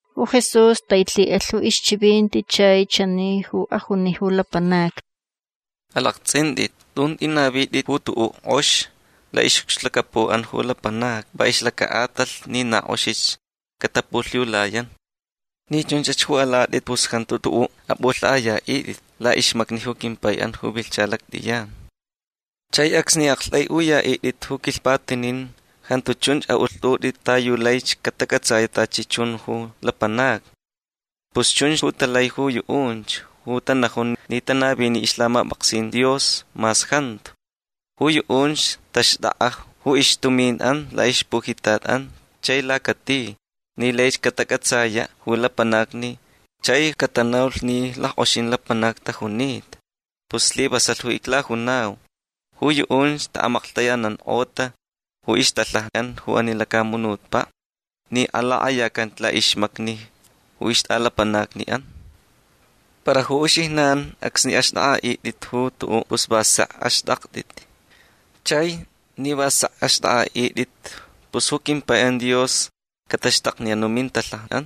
Ju Jesús tailhiʼalh ju ixchivinti chai chani ju ajuni ju lapanacni: ―Alaktsʼintʼit. Tun tʼinavitʼit ju tuʼuʼ kʼox laʼixʼucxlacapuʼan ju lapanacni va ixlacaʼatalh ni na kʼoxich catapulhiulayan. Ni chunch ju alatʼit pus jantu tuʼuʼ apʼulhaʼayaʼitʼit laʼixmacni ju quimpaiʼan ju vilhcha lactʼiyan. Chai acsni aʼaktʼaiʼuyaʼitʼit ju quilhpatinin jantu chunch aʼulhtʼutʼit ta yu laich catacʼatsayaʼ tachi chun ju lapanacni. Pus chunch ju talai ju yuʼunch ju tanajun ni tanavini ixlhamapʼaksin Dios mas jantu. Ju yuʼunch taxtʼakʼa ju ixtuminʼan laʼixpujitatʼan chai lacati ni laich catacʼatsayaʼ ju lapanacni chai catanaulh ni lackʼoxin lapanacni tajunita. Pus slivasalh ju iclajunau. Ju yuʼunch taʼamaklhtayanankʼota ju ixtalhajaʼan ju ani lacamunutpaʼ ni alakʼayacan laʼixmacni ju ixtʼalapanacniʼan. Para ju uxijnan acsni axtʼakʼaʼitʼit ju tuʼuʼ pus va sek axtʼaktʼit. Chai ni va sek ju axtʼakʼaʼitʼit pus ju quimpaiʼan Dios cataxtakniyan ju mintalhajaʼan.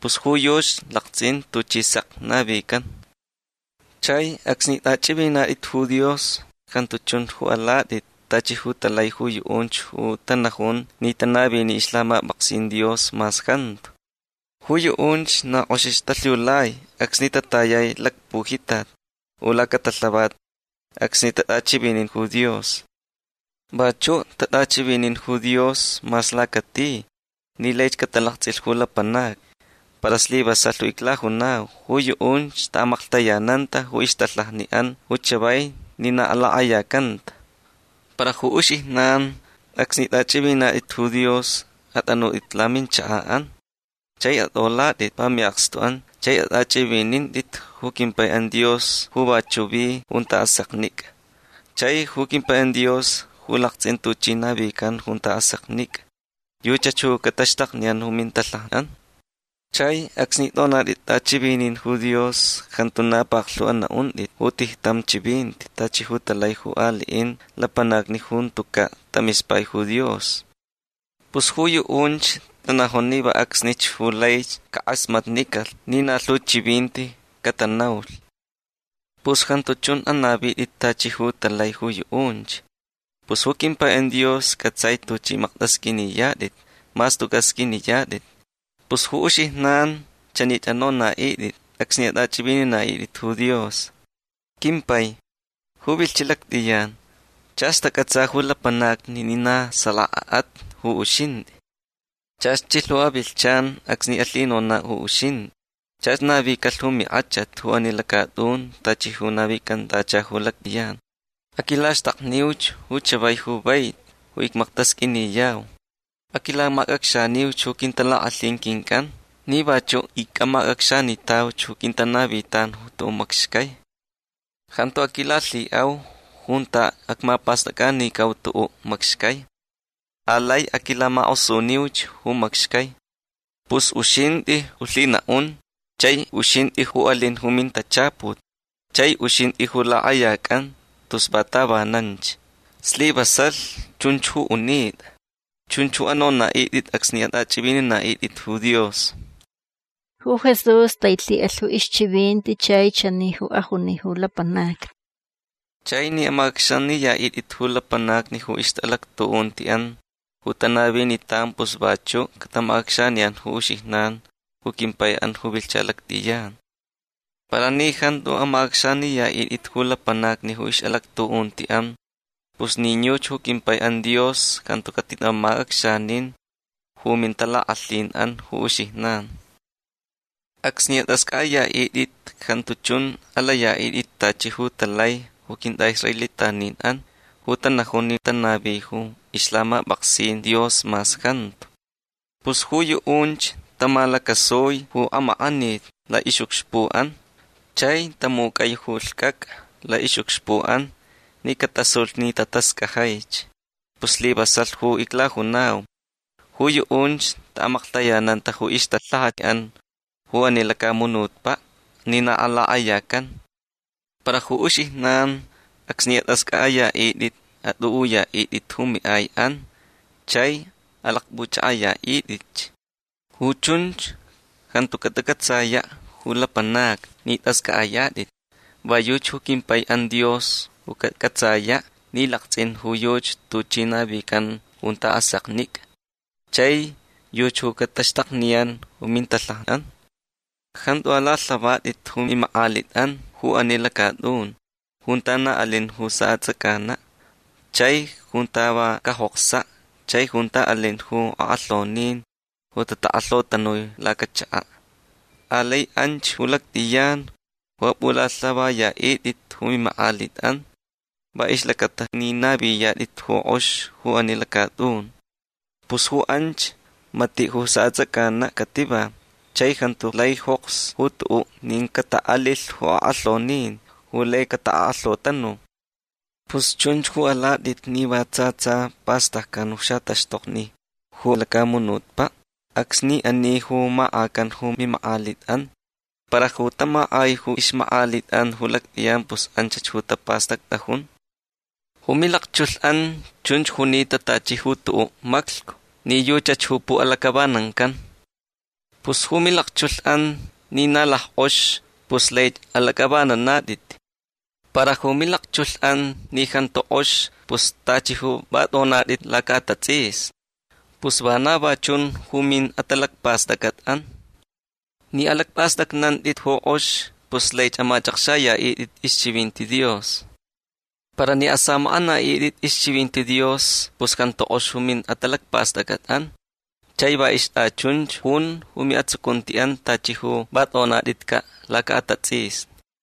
Pus ju yuchi laktsʼin tuchi sek navican. Chai acsni tʼachʼivinintʼit ju Dios jantu chun ju alatʼit tachi ju talai ju yuʼunch ju tanajun ni tanavini ixlhamapʼaksin Dios mas jantu. Ju yuʼunch na kʼoxich talhiulai acsni tatayai lacpujitat u lacatalhavat acsni tatʼachivinin ju Dios. Vachuʼ tatʼachivinin ju Dios mas lacati ni laich catalaktsʼilh ju lapanacni. Para slivasalh ju iclajunau. Ju yuʼunch taʼamaklhtayananta ju ixtalhajaʼan ju chavai ni na alakʼayacanta. Para ju uxijnan acsni tʼachʼivinintʼit ju Dios atʼanutʼit ju laminchakaʼan. Chai atʼolaʼitʼit va miʼakstuʼan. Chai atʼachʼivinintʼit ju quimpaiʼan Dios ju vachuʼ vi junta aseknicʼa. Chai ju quimpaiʼan Dios ju laktsʼin tuchi navican junta aseknicʼa yuchach ju cataxtakniyan ju mintalhajaʼan. Chai acsni tʼonatʼit tʼachivinin ju Dios jantu na paklhu anaʼuntʼit ju tijtam chivinti tachi ju talai ju aliʼin lapanacni ju jantucaʼ tamispai ju Dios. Pus ju yuʼunch tanajun ni va acsnich ju laich cakʼasmatnicalh ni na lhu chivinti catanaulhch. Pus jantu chun ju anavitʼit tachi ju talai ju yuʼunch. Pus ju quimpaiʼan Dios cʼatsai tuchʼi maktʼasqʼuiniyatʼit mas tucaʼ sqʼuiniyatʼit. Pus ju uxijnan chanich anonaʼitʼit acsni atʼachʼivininaʼitʼit ju Dios: Quimpai ju vilhchiʼ lactʼiyan chach tacʼatsa ju lapanacni ni na salakaʼat ju uxintʼi. Chach chilh ju avilhchan acsni alhinonaʼ ju uxintʼi. Chach navicalh ju minkʼachat ju ani lacatʼun tachi ju navicantacha ju lactʼiyan. Aquilaxtakniuch ju chavai ju vaiti ju icmaktasqʼuiniyau. Aquilamacʼacxaniuch ju quintalakʼalhin quincʼan ni vachuʼ icʼamacʼacxanitauch ju quintanavitan tuʼuʼ macxcai. Jantu aquilalhiʼau junta acmapastʼacʼanicau tuʼuʼ macxcai. Alai aquilamakʼosuniuch ju macxcai. Pus uxintʼi ju lhinaʼun chai uxintʼi ju alin ju mintachaput chai uxintʼi ju lakʼayacʼan tus va tavananch. Slivasalh chunch ju unitʼa. Chunch ju anonaʼitʼit acsni atʼachʼivininaʼitʼit ju Dios. Ju Jesús tailhiʼalh ju ixchivinti chai chani ju ajuni ju lapanacni: ―Chai ni amacʼacxaniyaʼitʼit ju lapanacni ju ixʼalactuʼuntiʼan ju tanavinitan pus vachuʼ catamacʼacxaniyan ju uxijnan ju quimpaiʼan ju vilhcha lactʼiyan. Para ni jantu amacʼacxaniyaʼitʼit ju lapanacni ju ixʼalactuʼuntiʼan pus nin yuchi ju quimpaiʼan Dios jantu catitamacʼacxanin ju mintalakʼalhinʼan ju uxijnan. Acsni atʼascʼaʼayaʼitʼit jantu chun alayaʼitʼit tachi ju talai ju quintʼaʼisraelitaninʼan ju tanajun ni tanavi ju ixlhamapʼaksin Dios mas jantu. Pus ju yuʼunch tamalacasui ju amakʼanit laʼixʼucxpuʼan chai tamucʼai ju lhcʼacʼa laʼixʼucxpuʼan ni catasulh ni tatascajaich. Pus slivasalh ju iclajunau. Ju yuʼunch taʼamaklhtayananta ju ixtalhajaʼan ju ani lacamunutpaʼ ni na alakʼayacan. Para ju uxijnan acsni atʼascʼaʼayaʼitʼit atʼuʼuyaʼitʼit ju miʼaiʼan chai alakpʼuchʼakʼayaʼitʼitch. Ju chunch jantu catacʼatsayaʼ ju lapanacni ni tʼascʼaʼayatʼit. Va yuchi ju quimpaiʼan Dios ju cacʼatsayaʼ ni laktsʼin ju yuchi tuchi navican junta aseknicʼa. Chai yuchi ju cataxtakniyan ju mintalhajaʼan. Jantu alalhavatʼit ju mimakʼalitʼan ju ani lacatʼun junta na alin ju saʼatsʼacanaʼ chai junta va cajoksaʼ chai junta alin ju akʼalhonin ju takʼalhotanui lacachakaʼ. Alai anch ju lactʼiyan ju apʼulhavayaʼitʼit ju mimakʼalitʼan va ixlacata ni naviyatʼit ju kʼox ju ani lacatʼun. Pus ju anch matiʼ ju saʼatsʼacanaʼ cativa chai jantu lai joks ju tuʼuʼ nin cataʼalilh ju akʼalhonin ju lai catakʼalhotanu. Pus chunch ju alatʼit ni va tsa tsa pastaccan ju xataxtokni ju lacamunutpaʼ acsni ani ju makʼacan ju mimakʼalitʼan. Para ju tamakʼai ju ixmakʼalitʼan ju lactʼiyan pus anchach ju tapastactʼajun. Ju milakchulhʼan chunch junita tachi ju tuʼuʼ maclhcu ni yuchach ju puʼalacʼavanancan. Pus ju milakchulhʼan ni na lackʼox pus laich alacʼavananatʼit. Para ju milakchulhʼan ni jantu kʼox pus tachi ju va tʼonatʼit lacaʼatatsʼisni. Pus vana va chun ju miʼatalacpastʼacʼatʼan. Ni alacpʼastʼacnantʼit ju kʼox pus laich amachʼakxayaʼitʼit ixchivinti Dios. Para ni asamakʼanaʼitʼit ixchivinti Dios pus jantu kʼox ju miʼatalacpastʼacʼatʼan chai va ixtʼachunch jun ju miʼatsucuntiʼan tachi ju va tʼonatʼitcaʼ lacaʼatatsʼisni.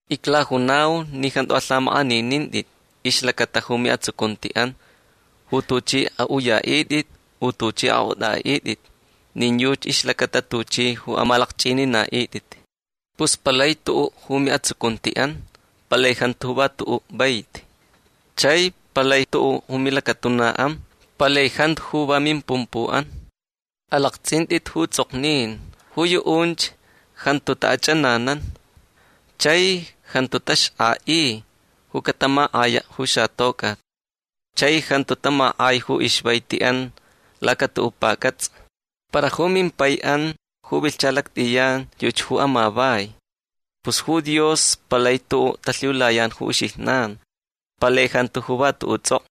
Iclajunau ni jantu alhamakʼaninintʼit ixlacata ju miʼatsucuntiʼan ju tuchʼi aʼuyaʼitʼit u tuchʼi akʼotʼaʼitʼit nin yuchi ixlacata tuchʼi ju amalakchʼininaʼitʼit. Pus palai tuʼuʼ ju miʼatsucuntiʼan. Palai jantu ju va tuʼuʼ vaiti. Chai palai tuʼuʼ ju milacatunaʼan. Palai jantu ju va mimpumpuʼan. Alaktsʼintʼit ju tsʼoknin. Ju yuʼunch jantu taʼachʼananan. Chai jantu taxkʼaʼi ju catamakʼayaʼ ju xatocʼat. Chai jantu tamakʼai ju ixvaitiʼan lacatuʼuʼ pacʼatsa. Para ju mimpaiʼan ju vilhcha lactʼiyan yuchi ju amavai. Pus ju Dios palai tuʼuʼ talhiulayan ju uxijnan. Palai jantu ju va tuʼuʼ tsʼokʼo.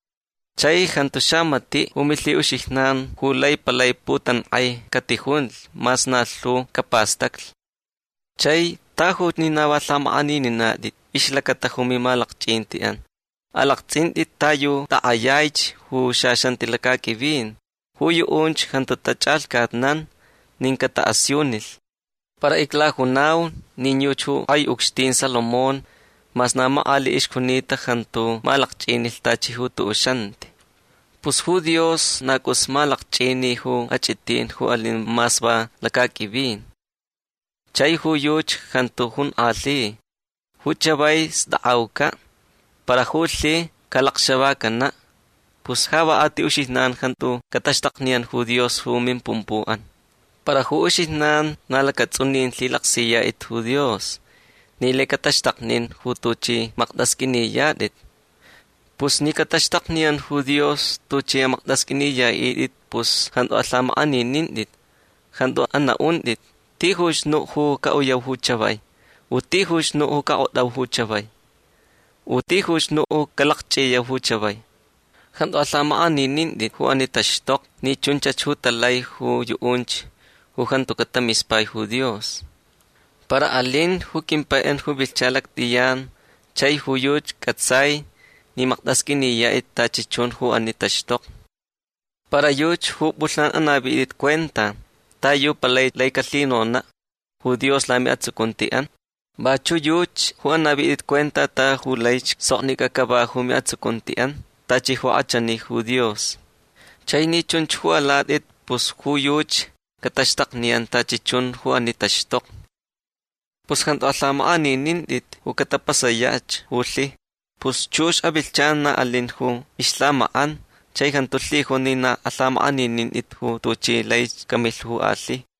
Chai jantu xamatiʼ ju milhiʼuxijnan ju lai palai putankʼai catijunlh mas na lhu capastaclh. Chai tajuch ni na va lhamakʼanininatʼit ixlacata ju mimalakchʼintichʼan. Alaktsʼintʼit ta yu takʼayaich ju xaxanti lacaqʼuivin. Ju yuʼunch jantu tachʼalhcatnan nin cataʼasiunilh. Para iclajunau nin yuchi ju kʼai ucxtin Salomón mas na makʼaliʼ ixjunita jantu malakchʼinilh tachi ju tuʼuʼ xanti. Pus ju Dios na cʼus malakchʼini ju achʼitin ju alin mas va lacaqʼuivin. Chai ju yuchi jantu jonkʼalhi. Ju chavai stakʼaucaʼ. Para ju lhi calacxavacanaʼ. Pus ja va a ti uxijnan jantu cataxtakniyan ju Dios ju mimpumpuʼan. Para ju uxijnan na lacatsʼunin lhilaksiyatʼit ju Dios ni lai cataxtaknin ju tuchʼi maktʼasqʼuiniyatʼit. Pus ni cataxtakniyan ju Dios tuchʼi amaktʼasqʼuiniyaʼitʼit pus jantu alhamakʼaninintʼit. Jantu anaʼuntʼit: “Tijuch nuʼ ju caʼuyau ju chavai”. U “tijuch nuʼ ju cakʼotʼau ju chavai”. U “tijuch nuʼ ju calakchʼiyau ju chavai”. Jantu alhamakʼaninintʼit ju ani taxtokni ni chunch ju talai ju yuʼunch ju jantucaʼ tamispai ju Dios. Para alin ju quimpaiʼan ju vilhcha lactʼiyan chai ju yuchi cʼatsai ni maktʼasqʼuiniyatʼit tachi chun ju ani taxtokni. Para yuchi ju pʼulhnan anavitʼit cuenta ta yu palai lai calhinonaʼ ju Dios lamiʼatsucuntiʼan. Vachuʼ yuchi ju anavitʼit cuenta ta yu laich soknicʼa cava ju miʼatsucuntiʼan tachi ju kʼachani ju Dios. Chai ni chunch ju alatʼit pus ju yuchi cataxtakniyan tachi chun ju ani taxtokni. Pus jantu alhamakʼaninintʼit ju catapasayach ju lhi. Pus chux avilhchan na alin ju ixlhamakʼan. Chai jantu lhijun ni na alhamakʼaninintʼit ju tuchi laich camilh ju alhi.